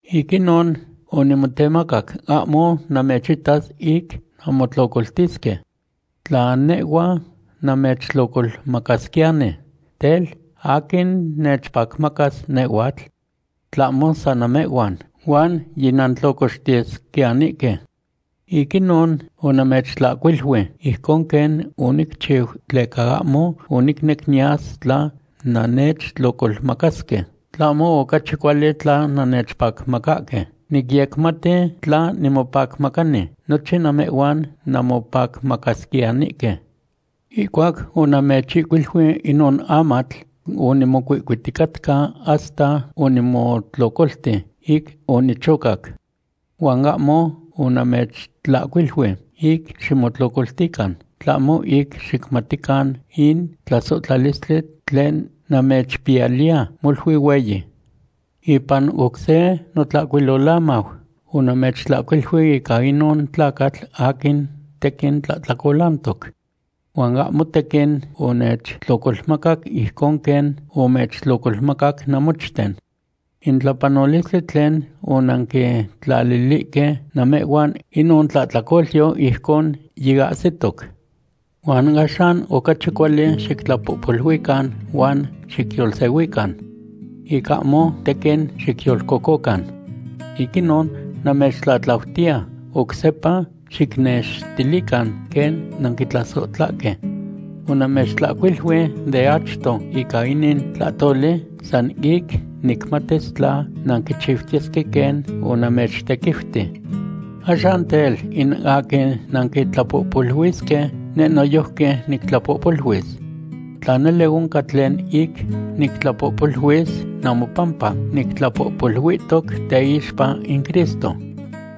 Ic inon onimotemacac ahmo namechitas ic nanmotlocoltisque. Tla nehhua namechtlocolmacasquiyani, tel, ¿aquin nechpacmacas nehhuatl? Tlahmo san namehhuan, huan yinantlocoxtiyesquiyanihque. Ic inon onamechtlahcuilui ijcon quen onicchiu, tleca ahmo onicnec niyas tla nannechtlocolmacahque, tlahmo ocachi cuali tla nannechpacmacahque. Nicyecmati tla nimopacmacani, nochin namehhuan nanmopacmacasquiyanihque. Ihcuac onamechihcuilui inon amatl, onimocuihcuiticatca hasta onimotlocolti ic onichocac. Huan ahmo onamechtlahcuilui ic ximotlocoltican, tlahmo ic xicmatican in tlasohtlalistli tlen namechpiyaliya molui hueyi. Ipan oc se notlahcuilolamau onamechtlahcuilui ica inon tlacatl aquin tequin tlahtlacolantoc. Huan ahmo tequin onechtlocolmacac ijcon quen omechtlocolmacac namochten. In tlapanolistli tlen onanquitlalilihque namehhuan inon tlahtlacolyo, ijcon yiahsitoc. Huan axan ocachi cuali xictlapohpoluican huan xicyolsehuican, ic ahmo tequin xicyolcococan. Ic inon namechtlatlautiya oc sepa xicnextilican quen nanquitlasohtlahque. Onamechtlahcuilui de achto ica inin tlahtoli san ic nicmatis tla nanquichiutiyesque quen onamechtequiuti. Axan tel, in aquin nanquitlapohpoluisque, neh noyojqui nictlapohpoluis. Tla nele oncan tlen ic nictlapohpoluis, namopampa nictlapohpoluihtoc teixpa in Cristo.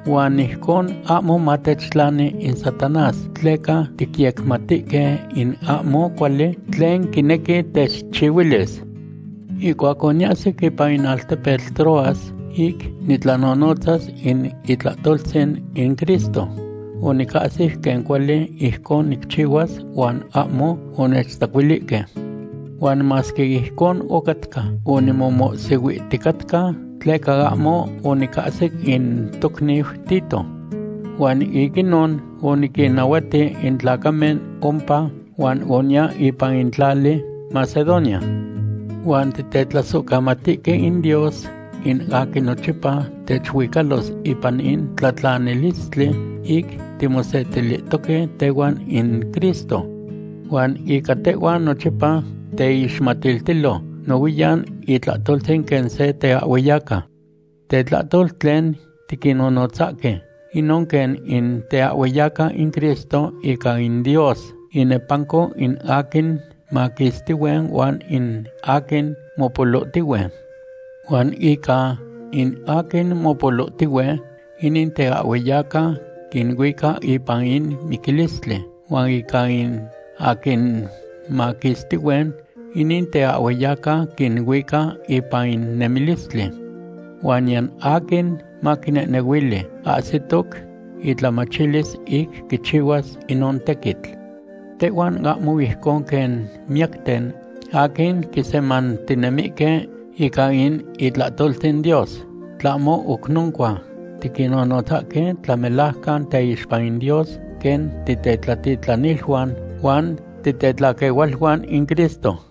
Huan ijcon ahmo matechtlani in Satanás tleca ticyecmatihque in ahmo cuali tlen quinequi techchihuilis. Ihcuac oniahsic ipan in altepetl Troas ic nitlanonotzas in itlahtoltzin in Cristo, onicahsi quen cuali ijcon nicchihuas huan ahmo onechtzacuilihque. Huan masque ijcon ocatca, onimomohsihuihticatca tleca ahmo onicasic in tocniu Tito. Huan ic inon oniquinnahuati in tlacamen ompa huan oniya ipan in tlali Macedonia. Huan titetlasohcamatihque in Dios, in aquin nochipa techiucalos ipan in tlatlanilistli ic timosetilihtoque tehuan in Cristo. Huan ica tehhuan nochipa teixmatiltilo nohuiyan itlahtoltzin quen se teahhueyaca. Tetlahtol tlen tiquinnonotzasque, inon quen in teahhueyaca in Cristo ica in Dios inepanco in aquin maquistihue huan in aquin mopolohtihue. Huan ica in aquin mopolohtihue, inin teahhueyaca quinuica ipan in miquilistli, huan ica in aquin maquistihue, inin teahhueyaca quinuica ipan in nemilistli. Huan niyan aquin maquinehnehuili ahsitoc itlamachilis ic quichihuas inon tequitl. Tehhuan ahmo ijcon quen miyacten aquin quisemantinemihque ica in itlahtoltzin Dios, tlahmo oc noncua, tinonotzahque tlamelajcan teixpa in Dios quen titetlatitlaniluan huan tetlaquehualuan in Cristo.